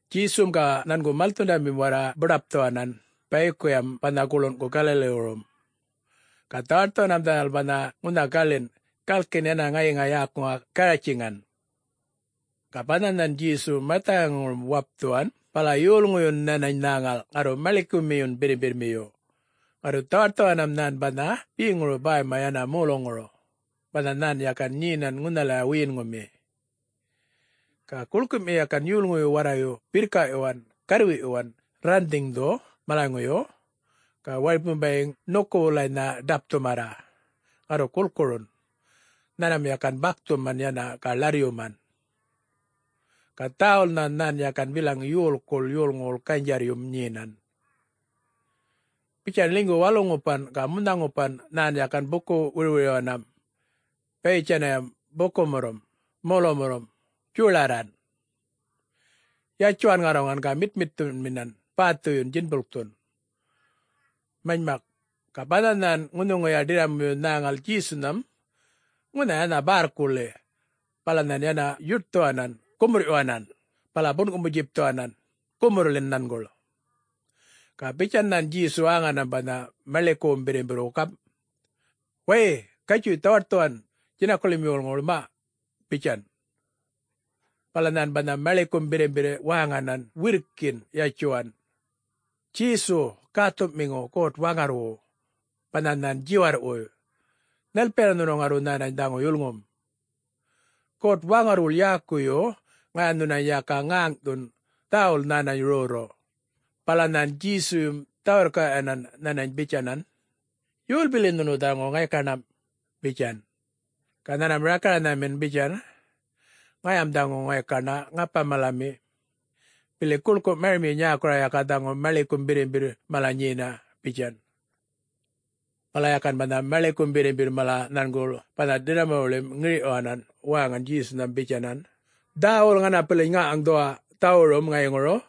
Djesum ga nhangu malthundamim warra buḏapthuwanan bayikuyam banha guḻungu Galiliwurum, ga dhawaṯthuwanam dhanal banha ŋunha galinꞌ, galkin yana ŋayiŋa yäkuŋa Garatjaŋan. Ga banha nhan Djesu marthaŋayŋurum wapthuwan bala yolŋuyun nhanany nhäŋal ŋarru maḻikumiyun birrimbirrmiyu, ŋarru dhawaṯthuwanam nhan banha beŋuru bäyma yana moluŋuru, banha nhan yakan nyenan ŋunhalaya wiyinŋumi. Ga guḻkumi yakan yolŋuyu warrayu birrkaꞌyuwan garrwiꞌyuwan rranhdhiŋdhu malaŋuyu, ga waripum bayiŋ ṉukun wulanynha ḏapthumarra, ŋarru gulkurun, nhanmam yakan bakthuman yana ga ḻarryuman. Ga dhäwulnha nhan yakan bilaŋ yolkuḻ yolŋuwuḻ ganydjarryum nyenan. Bitjan ḻinygu walu-ŋupan ga munha-ŋupanam nhan yakan buku-wirwiryuwanam bayitjanam bukumurrum molumurrum djolarran, yatjuwan ŋarruŋan ga mitmitthunminan bäthuyun djinbulkthun. Manymak, ga banha nhan ŋunhuŋuya ḏirramuyu nhäŋal Djesunham ŋunha yana bärrkuḻi bala nhan yana yuṯthuwanan gumurrꞌyuwanan bala bunꞌkumu-djipthuwanan gumurrḻin nhanguḻ. Ga bitjan nhan Djesu wäŋanam banha maḻikuwum birrimbirrwu gamꞌ, “Way, gatjuy dhawaṯthuwan djinakuḻim yolŋuwuḻ, maꞌ,” bitjan. Bala nhan banha maḻikum birrimbirr waŋanan wirrkin yatjuwan, “Djesu, Gäthuꞌmiŋu God-Waŋarrwu, banha nhan djiwarrꞌwuy, nhalpiyana nhunu ŋarru nhanany dhaŋu yulŋum? God-Waŋarrwuḻ yäkuyu ŋaya nhunany yaka ŋäŋꞌthun, dhäwul nhänany rrorru.” Bala nhan Djesuyum dhä-wirrkaꞌyuwanan nhanany bitjanan, “Yol bili nhunu dhaŋu ŋaykaṉam?” bitjan. Ga nhanmam rakaranhamin bitjan, “Ŋayam dhaŋu ŋaykaṉa ‘Ŋapa-malami’, bili guḻku marimi nyäkura yaka dhaŋu maḻikum birrimbirr mala nyena,” bitjan. Bala yakan banha maḻikum birrimbirr mala nhanguḻ banha ḏirramuwuḻim giriŋꞌthuwanan wäŋan Djesunham bitjanan, “Dhäwul ŋanapiliny ŋaŋꞌŋaŋdhuwa dhawurum ŋayiŋuru!”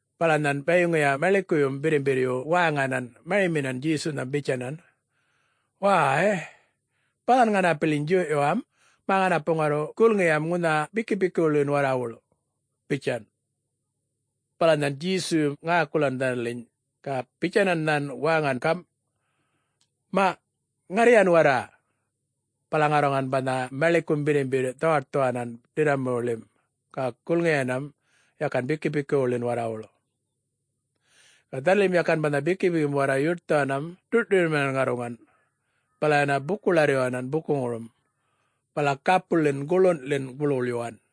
Bala nhan bayiŋuya maḻikuyum birrimbirryu wäŋanan mariminan Djesunham bitjanan, “Wäy, balan ŋanapiliny djuyꞌyuwam, mä ŋanapu ŋarru gulŋiyam ŋunha bikipikiwuḻin warrawuḻ,” bitjan. Bala nhan Djesuyum ŋäkulan dhanaliny ga bitjanan nhan wäŋan gamꞌ, “Maꞌ... ŋarriyan warra!” Bala ŋarruŋan banha maḻikum birrimbirr dhawaṯthuwanan ḏirramuwuḻim ga gulŋiyanam yakan bikipikiwuḻin warrawuḻ. Ga dhanalim yakan banha bikipikim warra yuṯthuwanan, ḏurꞌṯuryunminan ŋarruŋan, bala yana buku-ḻarryuwanan bukuŋurum, bala gapuḻin guḻunḻin guḻwuḻyuwan.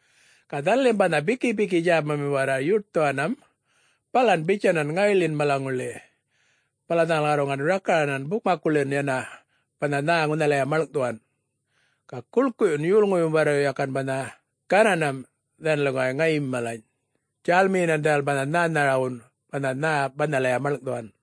Ga dhanalim banha bikipiki djägamim warra yuṯthuwanam balan bitjanan ŋayiḻin malaŋuḻi, bala dhanal ŋarruŋan rakaranan bukmakkuḻin yana banha nhä ŋunhalaya maḻŋꞌthuwan. Ga guḻkuyun yolŋuyum warrayu yakan banha gananam dhanaliŋguway ŋayim malany, djälmiyinan dhanal banha nhänharawun banha nhä banhalaya maḻŋꞌthuwan.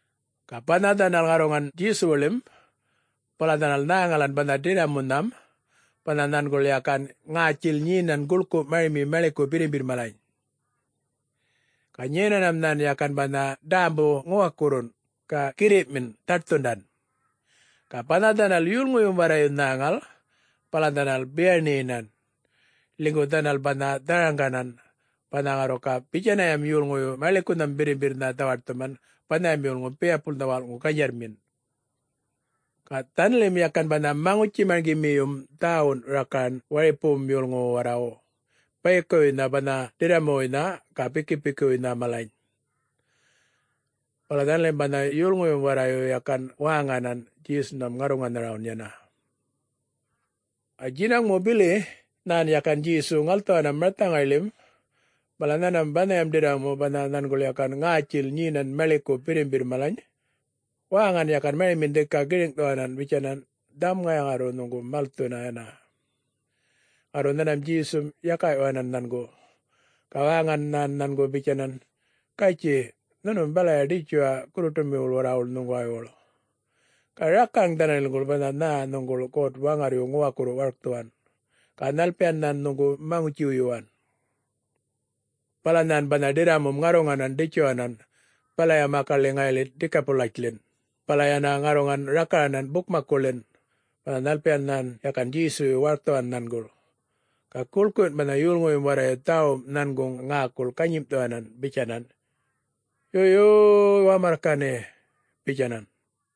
Ga banha dhanal ŋarruŋan Djesuwuḻim, bala dhanal nhäŋalan banha ḏirramunham banha nhanguḻ yakan ŋätjil nyenan guḻku marimi maḻiku birrimbirr malany. Ga nyenanam nhan yakan banha ḏämbum ŋuwakurrun ga girriꞌmin dhaṯthundan. Ga banha dhanal yolŋuyum warrayu nhäŋal, bala dhanal biyaṉinan, ḻinygu dhanal banha dharaŋganan, banha ŋarru ga bitjanayam yolŋuyu maḻikunham birrimbirrnha dhawaṯthuman banham yolŋu biyapulnha walꞌŋu ganydjarrmin. Ga dhanaḻim yakan banha maŋutji-marŋgimiyum dhäwun rakaran waripuwun yolŋuwu warrawu, bayikuwuynha banha ḏirramuwuynha ga bikipikiwuynha malany. Bala dhanalim banha yolŋuyum warrayu yakan wäŋanan Djesunham ŋarruŋanharawun yana. Ga djinaŋmu bili nhan yakan Djesu ŋalthuwanam marthaŋayḻim, bala nhanmam banhayam ḏirramu banha nhanguḻ yakan ŋätjil nyenan maḻiku birrimbirr malany, wäŋanan yakan mariminan dhika giriŋꞌthuwanan bitjanan, “Dhaŋum ŋaya ŋarru nhuŋgu malthuna yana!” Ŋarru nhanmam Djesum yakaꞌyuwanan nhangu, ga wäŋan nhan nhangu bitjanan, “Gatjuy, nhunum balaya ḏitjuwa gurruṯumiwuḻ warrawuḻ nhuŋguwaywuḻ, ga rakaraŋ dhanaḻiŋguḻ banha nhä nhuŋguḻ God-Waŋarryu ŋuwakurru warkthuwan, ga nhalpiyan nhan nhuŋgu maŋutji-wuyuwan.” Bala nhan banha ḏirramum ŋarruŋanan ḏitjuwanan balaya makaḻi ŋayiḻi Dikapulitjḻin, bala yana ŋarruŋan rakaranan bukmakkuḻin, banha nhalpiyan nhan yakan Djesuyu warkthuwan nhanguḻ. Ga guḻkuyun banha yolŋuyum warra dhäwum nhanguŋ ŋäkul ganyimꞌthuwanan bitjanan, “Yo... yuy Wamarrkani!” bitjanan.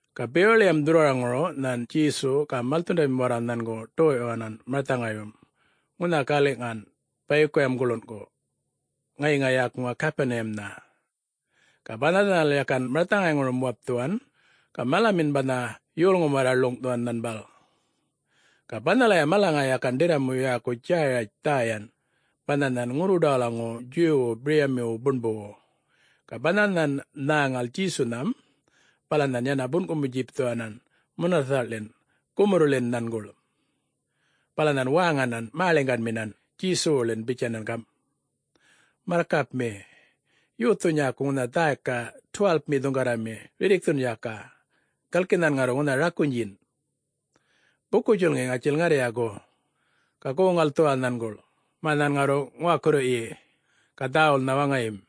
Ga bewaḻiyam dhurrwaraŋuru nhan Djesu ga malthundamim warra nhangu ḏoyꞌyuwanan marthaŋayyum ŋunha galiꞌŋan bayikuyam guḻungu, ŋayiŋa yäkuŋa Gapuniyamnha. Ga banha dhanal yakan marthaŋayŋurum wapthuwan, ga malamin banha yolŋum warra ḻuŋꞌthuwan nhanguḻ. Ga banhalaya malaŋa yakan ḏirramu yäku Djäratj dhäyan banha nhan ŋurruḏawalaŋu Djuwwu biryamiwu buṉbuwu. Ga banha nhan nhäŋal Djesunham, bala nhan yana bunꞌkumu-djipthuwanan munathaꞌḻin gumurrḻin nhanguḻ. Bala nhan wäŋanan mäḻiŋganminan Djesuwuḻin bitjanan gamꞌ, “Marrkapmi! Yothu nyäku ŋunha dhäyka 12-mi dhuŋgarrami rirrikthun yaka, galki nhan ŋarru ŋunha rakunydjin! Buku-djulŋi ŋatjil ŋarrya gu, ga goŋ-ŋalthuwa nhanguḻ mä nhän ŋarru ŋuwakurryi, ga dhäwulnha waŋayim.”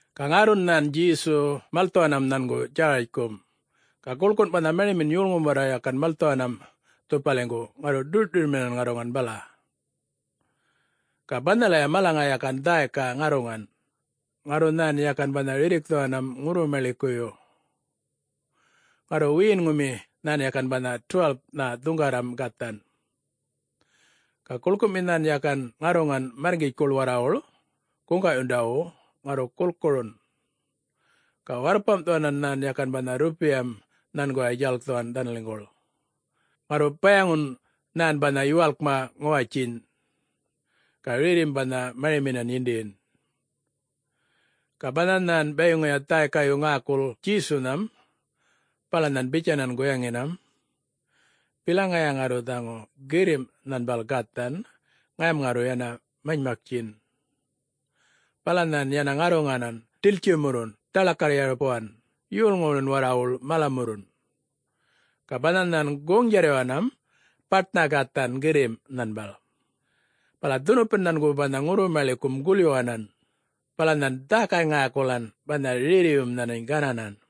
Ga ŋärrun nhan Djesu malthuwanam nhangu Djäratjkum. Ga gulkun banha marimin yolŋum warra yakan malthuwanam dhupaliŋgu ŋarru ḏur-ṯuryunminan ŋarruŋan bala. Ga banhalaya malaŋa yakan dhäyka ŋarruŋan, ŋarru nhan yakan banha rirrikthuwanam ŋurru-maḻikuyu. Ŋarru wiyinꞌŋumi nhan yakan banha 12-nha dhuŋgarram gathan. Ga guḻkumi nhan yakan ŋarruŋan märrŋgitjkuḻ warrawuḻ guŋgaꞌyundawu ŋarru gulkurun. Ga warrpamꞌthuwan nhan yakan banha rrupiyam nhanguway djalkthuwan dhanaliŋguḻ, ŋarru bayaŋun nhan banha yuwalkma ŋuwatjiny, ga rerrim banha mariminan yindiyin. Ga banha nhan bayiŋuya dhäykayu ŋäkul Djesunham, bala nhan bitjanan guyaŋinam, “Bilaŋ ŋaya ŋarru dhaŋu girrimꞌ nhanbal gathan ŋayam ŋarru yana manymaktjin.” Bala nhan yana ŋarruŋanan ḏiltjimurrun dhaḻakarr-yarpuwan yolŋuwuḻin warrawuḻ malamurrun. Ga banha nhan goŋ-djarryuwanam baṯnha gathan girrimꞌ nhanbal. Bala dhunupan nhangu banha ŋurru-maḻikum gulyuwanan, bala nhan dhäkay-ŋäkulan banha rerriyum nhanany gananan.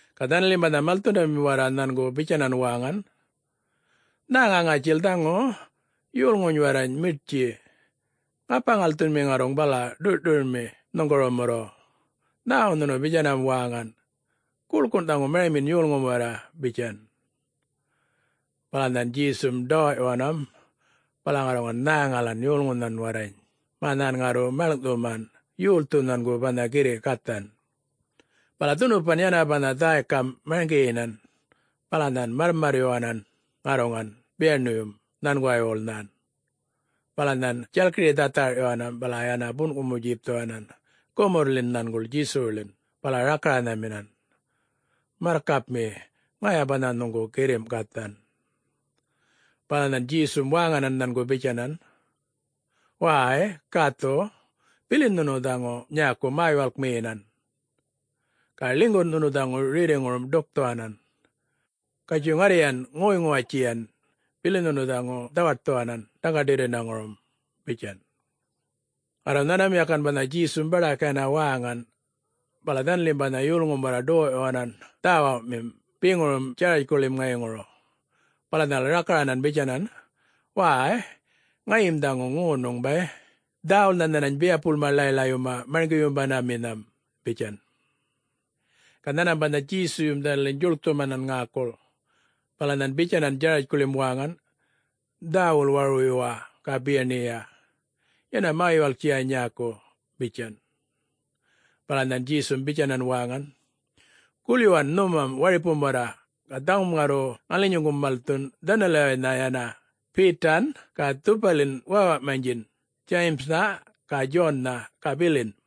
Ga dhanalim banha malthundamim warra nhangu bitjanan wäŋan, “Nhäŋa ŋatjil dhaŋu yolŋuny warrany miṯtji, ŋapa-ŋalthumanmi ŋarruŋ bala ḏurꞌ-ṯuryunmi nhuŋgurumurru, nhäwu nhunu bitjanam wäŋan, guḻkun dhaŋu marimin yolŋum warra,” bitjan. Bala nhan Djesum ḏawaꞌyuwanam bala ŋarruŋan nhäŋalan yolŋunham warrany mä nhan ŋarru maḻŋꞌthuman yolthu nhangu banha girriꞌ gathan. Bala dhunupan yana banha dhäykam marŋgiyinan bala nhan marrmarryuwanan ŋarruŋan biyaṉuyum nhanguwaywuḻ nhan, bala nhan djalkiri dhatharꞌyuwanan bala yana bunꞌkumu-djipthuwanan gumurrḻin nhanguḻ Djesuwuḻin bala rakaranhaminan, “Marrkapmi, ŋaya banha nhuŋgu girriꞌ gathan.” Bala nhan Djesum wäŋanan nhangu bitjanan, “Wäy... gäthu, bilin nhunu dhaŋu nyäku mä-yuwalkmiyinan, ga ḻinygun nhunu dhaŋu rerriŋurum ḏukthuwanan. Gatjuy ŋarryan ŋoy-ŋuwatjiyan bilin nhunu dhaŋu dhawaṯthuwanan dhaŋga-ḏirrŋurum,” bitjan. Ŋarru nhanmam yakan banha Djesum baḏak yana wäŋan, bala dhanalim banha yolŋum warra ḏoyꞌyuwanan dhäwumim beŋurum Djäratjkuḻim ŋayiŋuru, bala dhanal rakaranan bitjanan, “Wäy, ŋayim dhaŋu ŋonuŋ bay! Dhäwulnha nhanany biyapulma ḻay-ḻayyuma Marŋgiyumandaminham,’ bitjan. Ga nhanmam banha Djesuyum dhanaliny djuḻkthumanan ŋäkul, bala nhan bitjanan Djäratjkuḻim wäŋan, “Dhäwul warwuyuwa ga biyaṉiya, yana mä-yuwalktjiya nyäku,” bitjan. Bala nhan Djesum bitjanan wäŋan, “Gulꞌyuwan nhumam waripum warra ga dhaŋum ŋarru ŋalinyuŋgum malthun dhanaliwaynha yana Betan ga dhupalin wäwaꞌmanydjin Djayimnha ga Djonnha ga bilin.”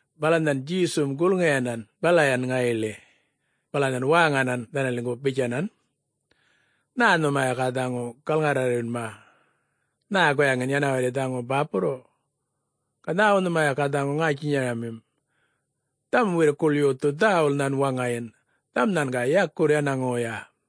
Bala nhan Djesum gulŋiyanan balayan ŋayiḻi, bala nhan wäŋanan dhanaliŋgu bitjanan, “Nhä nhuma yaka dhaŋu galŋarrarrayunma, nhä guyaŋin yana warri dhaŋu bäpurrun? Ga nhäwu nhuma yaka dhaŋu ŋätjinyaramim? Dhaŋum wirrkuḻ yothu dhäwul nhan waŋayin, dhaŋum nhan ga yakurr yana ŋoya.”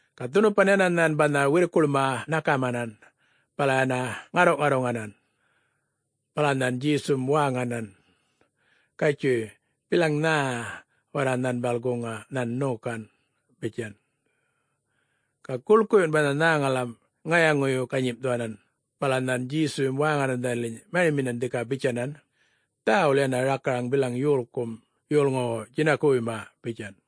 Ga dhunupan yana nhan banha wirrkuḻma ṉakamanan, bala yana ŋarruꞌŋarruŋanan. Bala nhan Djesum wäŋanan, “Gatjuy bilaŋ nhä warra nhanbal guŋa nhan ṉokan,” bitjan. Ga guḻkuyun banha nhäŋalam ŋayaŋu-ganyimꞌthuwanan bala nhan Djesuyum wäŋanan dhanaliny mariminan dhika bitjanan, “Dhäwul yana rakaraŋ bilaŋ yolkum yolŋuwu djinakuwuyma,” bitjan.